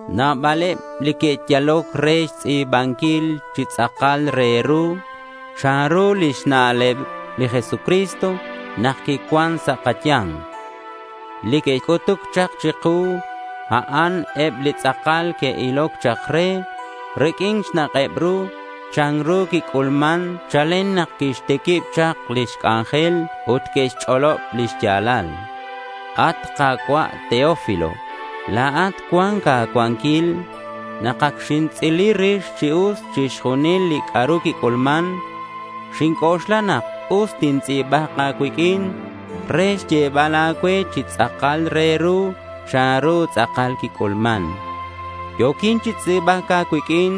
Nabaleb li que'yaloc re xtz'i̱banquil chi tz'akal re ru chanru lix na'leb li Jesucristo nak quicuan sa' kaya̱nk. Li que'c'utuc chak chiku, a'an eb li tz'akal que'iloc chak re riq'uin xnak'eb ru chanru quic'ulman chalen nak quixtiquib chak lix c'anjel ut que'xch'olob li xya̱lal. At Ka̱cua' Teófilo, la̱at cuan a̱cuanquil. Nak ac xintz'ili rix chi us chixjunil li c'a'ru quic'ulman, xinc'oxla nak us tintz'i̱bak a̱cuiq'uin re xyebal a̱cue chi tz'akal re ru chanru tz'akal quic'ulman. Yo̱quin chi tz'i̱bac a̱cuiq'uin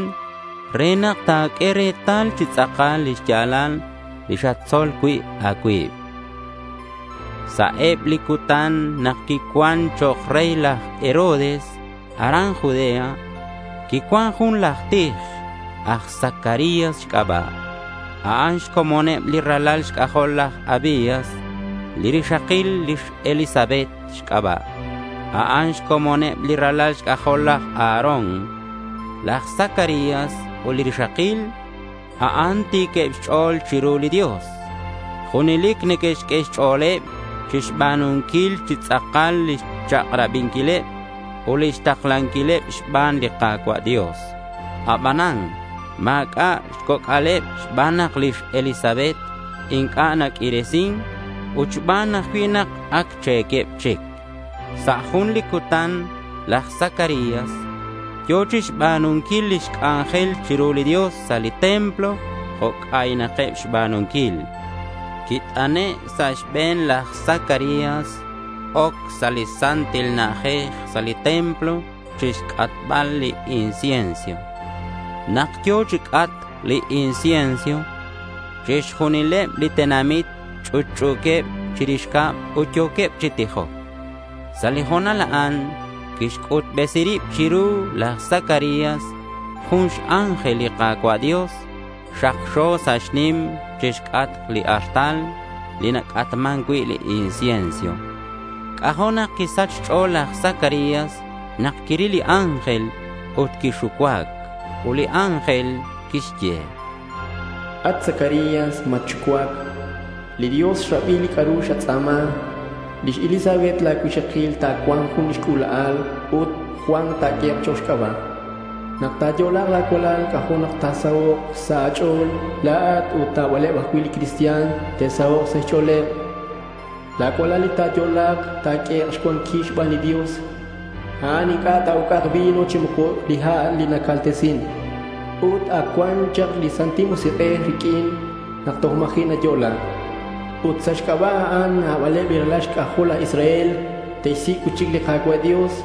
re nak ta̱q'ue retal chi tz'akal li xya̱lal li xatzol cui' a̱cuib. Sa' eb li cutan nak quicuan chok' rey laj Herodes aran Judea, quicuan jun laj tij aj Zacarías xc'aba'. A'an xcomoneb li ralal xc'ajol laj Abías. Li rixakil xElisabet xc'aba'. A'an xcomoneb li ralal xc'ajol laj Aarón. Laj Zacarías ut li rixakil, a'an ti̱queb xch'o̱l chiru li Dios. Junelic neque'xq'ue xch'o̱leb chixba̱nunquil chi tz'akal lix chak'rabinquileb ut lix taklanquileb xban li Ka̱cua' Dios. Abanan ma̱c'a' xcoc'aleb xban nak lix Elisabet inc'a' naq'uiresin ut xban ajcui' nak ac che̱queb chic. Sa' jun li cutan laj Zacarías yo̱ chixba̱nunquil lix c'anjel chiru li Dios sa' li templo jo' c'aynakeb xba̱nunquil. Quit'ane' sa' xbe̱n laj Zacarías oc sa' li Santil Na'ajej sa' li templo chixc'atbal li incienso. Nak yo̱ chi c'atc li incienso chixjunileb li tenamit ch'utch'u̱queb chirix cab ut yo̱queb chi tijoc. Sa' li ho̱nal a'an quixc'utbesi rib chiru laj Zacarías jun x-ángel li Ka̱cua' Dios. Xakxo sa' xnim chixc'atk li artal li nac'atman cui' li incienso. C'ajo' nak quisach xch'o̱l laj Zacarías nak quiril li ángel ut quixucuac. Ut li ángel quixye: —At Zacarías, matxucuac. Li Dios xrabi li c'a'ru xatz'a̱ma. Lix Elisabet la̱ cuixakil ta̱cua̱nk jun xc'ula'al ut Juan ta̱q'ue chok' xc'aba'. Nak ta̱yo'la̱k la̱ cualal, c'ajo' nak ta̱sahok' sa' a̱ch'o̱l la̱at ut nabaleb ajcui' li cristian te'sahok' sa' xch'o̱leb. La̱ cualal li ta̱yo'la̱k ta̱q'uehek' xcuanquil xban li Dios. A'an inc'a' ta̱uc'ak vino chi moco li ha' li nacaltesin. Ut ac cua̱nk chak li Santil Musik'ej riq'uin nak toj ma̱ji'ak nayo'la. Ut sa' xc'aba' a'an nabaleb li ralal xc'ajol laj Israel te'xsic' cui'chic li Ka̱cua' Dios.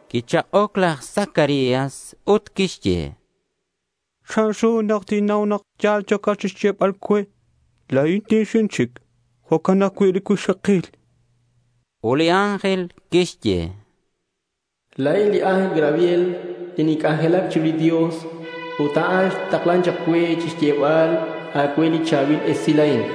Quichak'oc laj Zacarías ut quixye: —¿Chanru nak tinnau nak ya̱l li yo̱cat chixyebal cue? La̱in ti̱xin chic. Jo'can ajcui' li cuixakil, chan. Ut li ángel quixye: —La̱in li ángel Gabriel li ninc'anjelac chiru li Dios. Ut a'an xtaklan chak cue xyebal a̱cue li cha̱bil esilal a'in.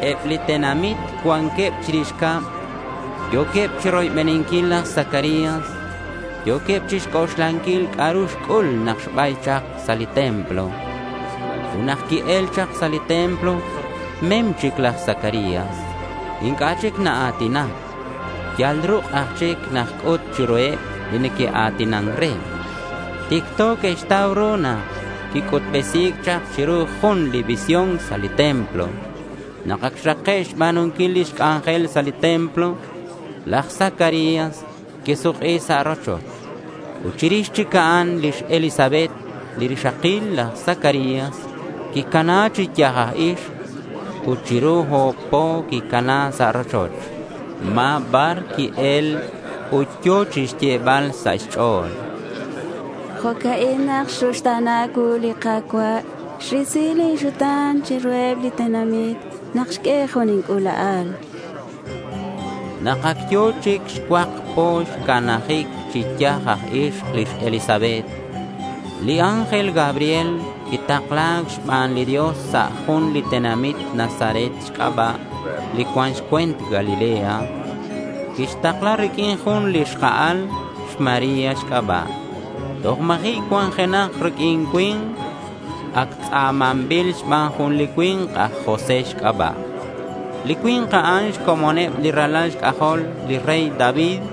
Eb li tenamit cuanqueb chirix cab. Yo̱queb chiroybeninquil laj Zacarías. Yo̱queb chixc'oxlanquil c'a'ru xc'ul nak xbay chak sa' li templo. Ut nak qui-el chak sa' li templo mem chic laj Zacarías. Inc'a' chic naa̱tinac. Yal ruk' aj chic naxc'ut chiruheb li neque'a̱tinan re. Ticto que'xtau ru nak quic'utbesi̱c chak chiru jun li visión sa' li templo. Nak ac xrake' xba̱nunquil lix c'anjel sa' li templo, laj Zacarías quisuk'i sa' rochoch. Ut chirix chic a'an lix Elisabet, li rixakil laj Zacarías, quicana chi yaj aj ixk. Ut chiru o̱b po quicana sa' li rochoch. Ma̱ bar qui-el ut yo̱ chixyebal sa' xch'o̱l: —Jo'ca'in nak xruxta̱na cuu li Ka̱cua'. Xrisi lin xuta̱n chiruheb li tenamit nak xq'ue jun lin c'ula'al, chan. Nak ac yo̱ chic xcuak po xcanajic chi yaj aj ixk lix Elisabet, li ángel Gabriel quitakla̱c xban li Dios sa' jun li tenamit Nazaret xc'aba' li cuan xcue̱nt Galilea. Quitakla̱c riq'uin jun li xka'al xMaría xc'aba' toj ma̱ji' cuanjenak riq'uin cui̱nk. Ac tz'a̱manbil xban jun li cui̱nk aj José xc'aba'. Li cui̱nk a'an xcomoneb li ralal xc'ajol li rey David.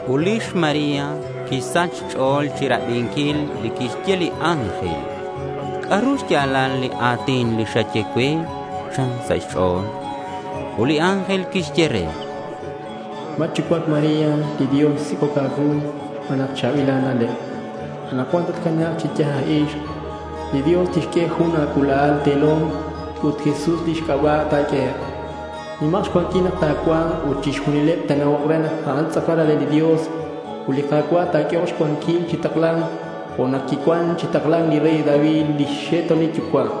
Ut lix María quisach xch'o̱l chirabinquil li quixye li ángel. —¿C'a'ru xya̱lal li a̱tin li xye cue? chan sa' xch'o̱l. Ut li ángel quixye re: —Matxucuac, María. Li Dios xsic'oc a̱cuu xban nak cha̱bil a̱na'leb. Anakcuan tatcana̱k chi yaj aj ixk. Li Dios tixq'ue jun a̱c'ula'al te̱lom ut Jesús lix c'aba' ta̱q'ue. Nimak xcuanquil nak ta̱cua̱nk ut chixjunileb te'na'ok re nak a'an tz'akal Ralal li Dios. Ut li Ka̱cua' ta̱q'uehok xcuanquil chi takla̱nc jo' nak quicuan chi takla̱nc li rey David lix xe'to̱nil yucua'.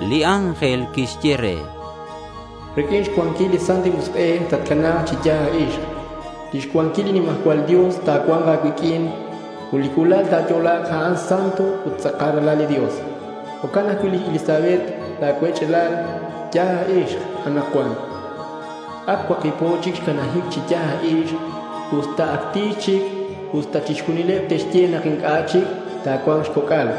Li ángel quixye re: —Riq'uin xcuanquil li Santil Musik'ej tatcana̱k chi yaj aj ixk. Lix cuanquil li nimajcual Dios ta̱cua̱nk a̱cuiq'uin. Ut li c'ula'al li ta̱yo'la̱k, a'an santo ut tz'akal ralal li Dios. Jo'can ajcui' lix Elisabet la̱ cuech'alal yaj aj ixk anakcuan. Ac cuakib po chic xcanajic chi yaj aj ixk, usta ac ti̱x chic ut usta chixjunileb que'xye nak a'an inc'a' ta̱cua̱nk xcoc'al.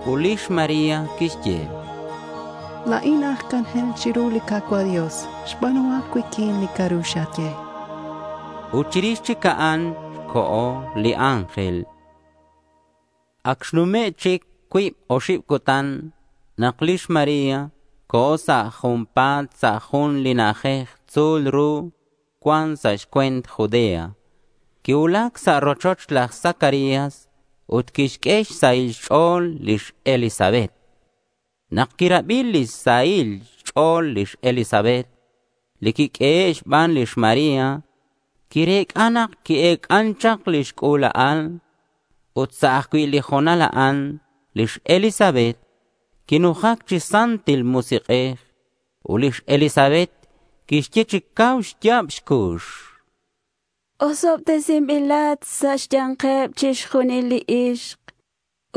Ut lix María quixye: —La̱in aj c'anjel chiru li Ka̱cua' Dios. Xba̱nuhak cuiq'uin li c'a'ru xaye, chan. Ut chirix chic a'an, co̱ li ángel. Ac xnume' chic cuib oxib cutan nak lix María co̱ sa' junpa̱t sa' jun li na'ajej tzu̱l ru cuan sa' xcue̱nt Judea. Quicuulac sa' rochoch laj Zacarías ut quixq'ue xsahil xch'o̱l lix Elisabet. Nak quirabi lix sahil xch'o̱l lix Elisabet li quiq'uehe' xban lix María, quirec'a nak qui-ec'an chak lix c'ula'al. Ut sa' ajcui' li ho̱nal a'an lix Elisabet quinujac chi Santil Musik'ej. Ut lix Elisabet quixye chi cau xya̱b xcux: —Osobtesinbilat sa' xya̱nkeb chixjunileb li ixk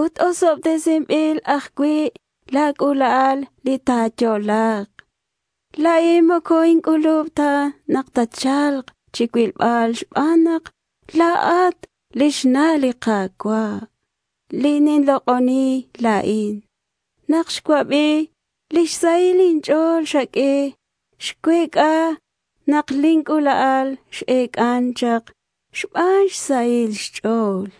ut osobtesinbil ajcui' la̱ c'ula'al li ta̱yo'la̱k. La̱in moco inc'ulub ta nak tatcha̱lk chicuilbal xban nak la̱at lix na' li Ka̱cua', li ninlok'oni la̱in. Nak xcuabi lix sahil inch'o̱l xaq'ue, xcuec'a nak lin c'ula'al x-ec'an chak xban xsahil xch'o̱l.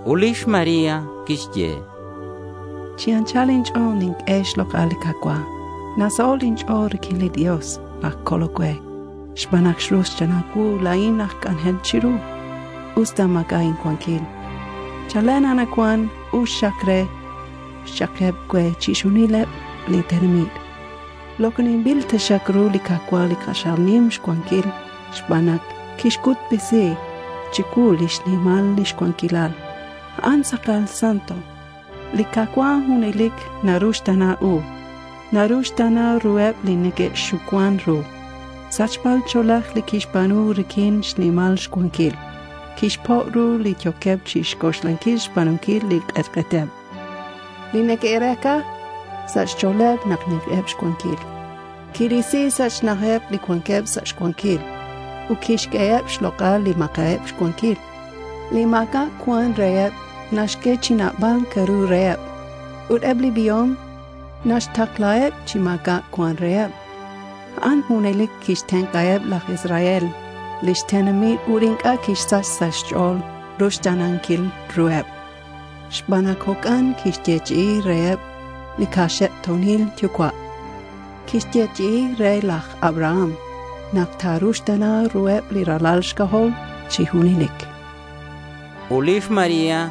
Ut lix María quixye: —Chi anchal inch'o̱l ninq'ue xlok'al li Ka̱cua'. Nasaho' sa' inch'o̱l riq'uin li Dios laj Colol cue, xban nak xruxta̱na cuu la̱in aj c'anjel chiru, usta ma̱c'a' incuanquil. Chalen anakcuan us xak re cha'keb cue chixjunileb li tenamit. Lok'oninbil taxak ru li Ka̱cua' li k'axal nim xcuanquil xban nak quixc'utbesi chicuu lix nimal lix cuanquilal. A'an tz'akal santo. Li Ka̱cua' junelic na-uxta̱nan u. Naruxta̱na ruheb li neque'xucuan ru. Sachba ch'o̱lej li quixba̱nu riq'uin xnimal xcuanquil. Quixpo' ru li yo̱queb chixc'oxlanquil xba̱nunquil li k'etk'eteb, li neque'rec'a sa' xch'o̱leb nak ni̱nkeb xcuanquil. Quirisi sa' xna'ajeb li cuanqueb sa' xcuanquil. Ut quixq'ueheb xlok'al li ma̱c'a'eb xcuanquil. Li ma̱c'a' cuan reheb naxq'ue chi nabal c'a'ru reheb. Ut eb li biom naxtaklaheb chi ma̱c'a' cuan reheb. A'an junelic quixtenk'aheb laj Israel lix tenamit ut inc'a' quisach sa' xch'o̱l ruxta̱nanquil ruheb, xban nak jo'can quixyechi'i reheb li kaxe'to̱nil yucua'. Quixyechi'i re laj Abraham nak ta̱ruxta̱na ruheb li ralal xc'ajol chi junelic, chan lix María.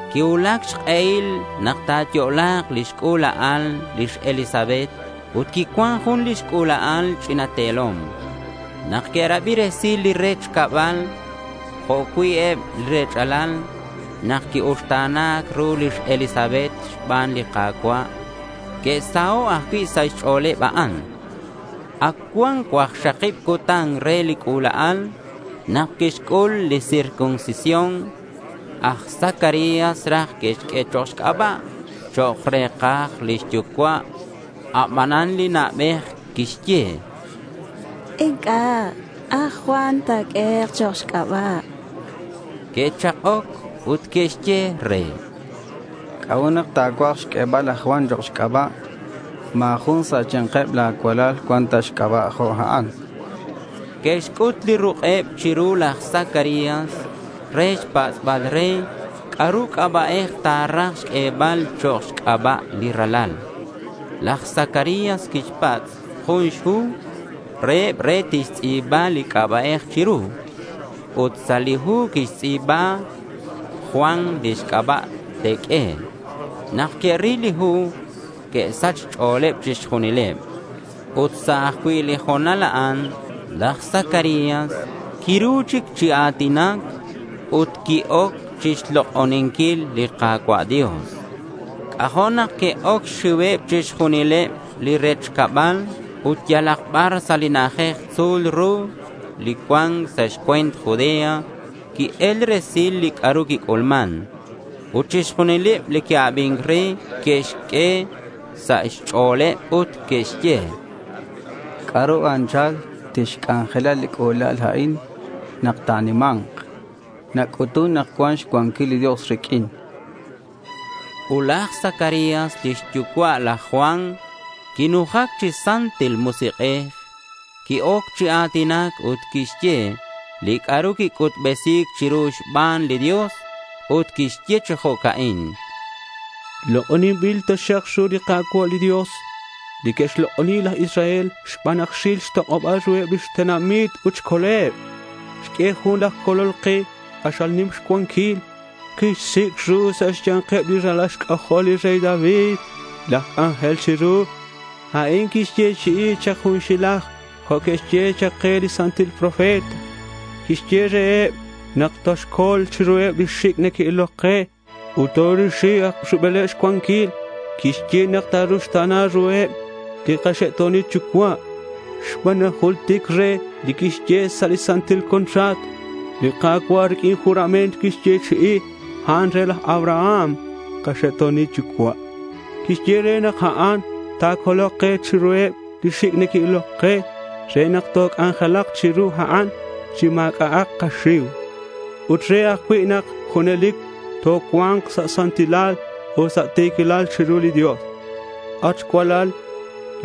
Quicuulac xk'ehil nak ta̱yo'la̱k lix c'ula'al lix Elisabet ut quicuan jun lix c'ula'al ch'ina te̱lom. Nak que'rabi resil li rech cabal jo' cui' eb li rech'alal nak qui-uxta̱na̱c ru lix Elisabet xban li Ka̱cua', que'saho' ajcui' sa' xch'o̱leb a'an. Ac cuan cuakxakib cutan re li c'ula'al, nak quixc'ul li circuncisión. Aj Zacarías raj que'xq'ue chok' xc'aba' chok' re̱kaj lix yucua'. Abanan li na'bej quixye: —Inc'a'. Aj Juan takaq'ue chok' xc'aba', chan. Que'chak'oc ut que'xye re: —¿C'a'ut nak ta̱cuaj xq'uebal aj Juan chok' xc'aba'? Ma̱ jun sa' xya̱nkeb la̱ cuech'alal cuan ta xc'aba' jo' a'an, chanqueb. Que'xc'ut li ruk'eb chiru laj Zacarías re xpatz'bal re c'a'ru c'aba'ej ta̱raj xq'uebal chok' xc'aba' li ralal. Laj Zacarías quixpatz' jun xhu reheb re tixtz'i̱ba li c'aba'ej chiru. Ut sa' li hu quixtz'i̱ba “Juan lix c'aba' te̱q'ue”. Nak que'ril li hu, que'sach xch'o̱leb chixjunileb. Ut sa' ajcui' li ho̱nal a'an laj Zacarías quiru chic chi a̱tinac ut qui-oc chixlok'oninquil li Ka̱cua' Dios. C'ajo' nak que'oc xxiuheb chixjunileb li rech cabal ut yalak bar sa' li na'ajej tzu̱l ru li cuan sa' xcue̱nt Judea qui-el resil li c'a'ru quic'ulman. Ut chixjunileb li que'abin re que'xq'ue sa' xch'o̱leb ut que'xye: —¿C'a'ru anchal tixc'anjela li c'ula'al a'in nak ta̱nima̱nk? Nac'utun nak cuan xcuanquil li Dios riq'uin, chanqueb. Ut laj Zacarías lix yucua' laj Juan quinujac chi Santil Musik'ej. Qui-oc chi a̱tinac ut quixye li c'a'ru quic'utbesi̱c chiru xban li Dios. Ut quixye chi jo'ca'in: —Lok'oninbil taxak li Ka̱cua' Dios li neque'xlok'oni laj Israel xban nak xril xtok'oba̱l ruheb lix tenamit ut xcoleb. Xq'ue jun laj Colol ke k'axal nim xcuanquil. Quixsic' ru sa' xya̱nkeb li ralal xc'ajol li rey David laj c'anjel chiru. A'in quixyechi'i chak junxilaj jo' que'xye ke li santil profetas. Quixye reheb nak toxcol chiruheb li xic' neque'iloc ke ut torisi rubeleb xcuanquil. Quixye nak ta̱ruxta̱na ruheb li kaxe'to̱nil yucua' xban nak jultic re li quixye sa' li santil contrato. Li Ka̱cua' riq'uin juramento quixyechi'i a'an re laj Abraham li kaxe'to̱nil yucua'. Quixye re nak a'an ta̱colok ke chiruheb li xic' neque'iloc ke re nak toc'anjelak chiru a'an chi ma̱c'a'ak kaxiu, ut re ajcui' nak junelic tocua̱nk sa' santilal ut sa' ti̱quilal chiru li Dios. At cualal,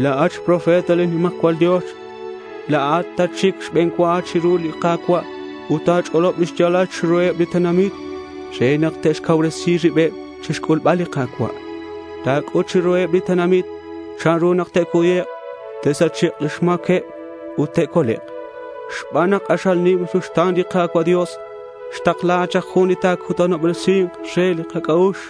la̱at xprofeta li nimajcual Dios. La̱at tatxic xbe̱n cua chiru li Ka̱cua' ut ta̱ch'olob li xya̱lal chiruheb li tenamit re nak te'xcauresi ribeb chixc'ulbal li Ka̱cua'. Ta̱c'ut chiruheb li tenamit chanru nak te'cuyek' te'sachek' lix ma̱queb ut te'colek'. Xban nak k'axal nim ruxta̱n li Ka̱cua' Dios, xtakla chak li Jun li ta̱cutanobresi̱nk re li kac'a'ux.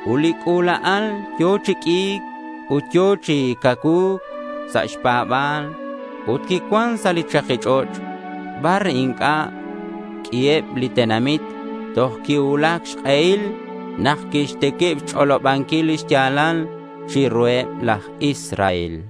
Ut li c'ula'al yo̱ chi q'ui̱c ut yo̱ chi cacuu̱c sa' xpa̱ba̱l. Ut quicuan sa' li chaki ch'och' bar inc'a' q'uiheb li tenamit toj quicuulac xk'ehil nak quixtiquib xch'olobanquil li xya̱lal chiruheb laj Israel.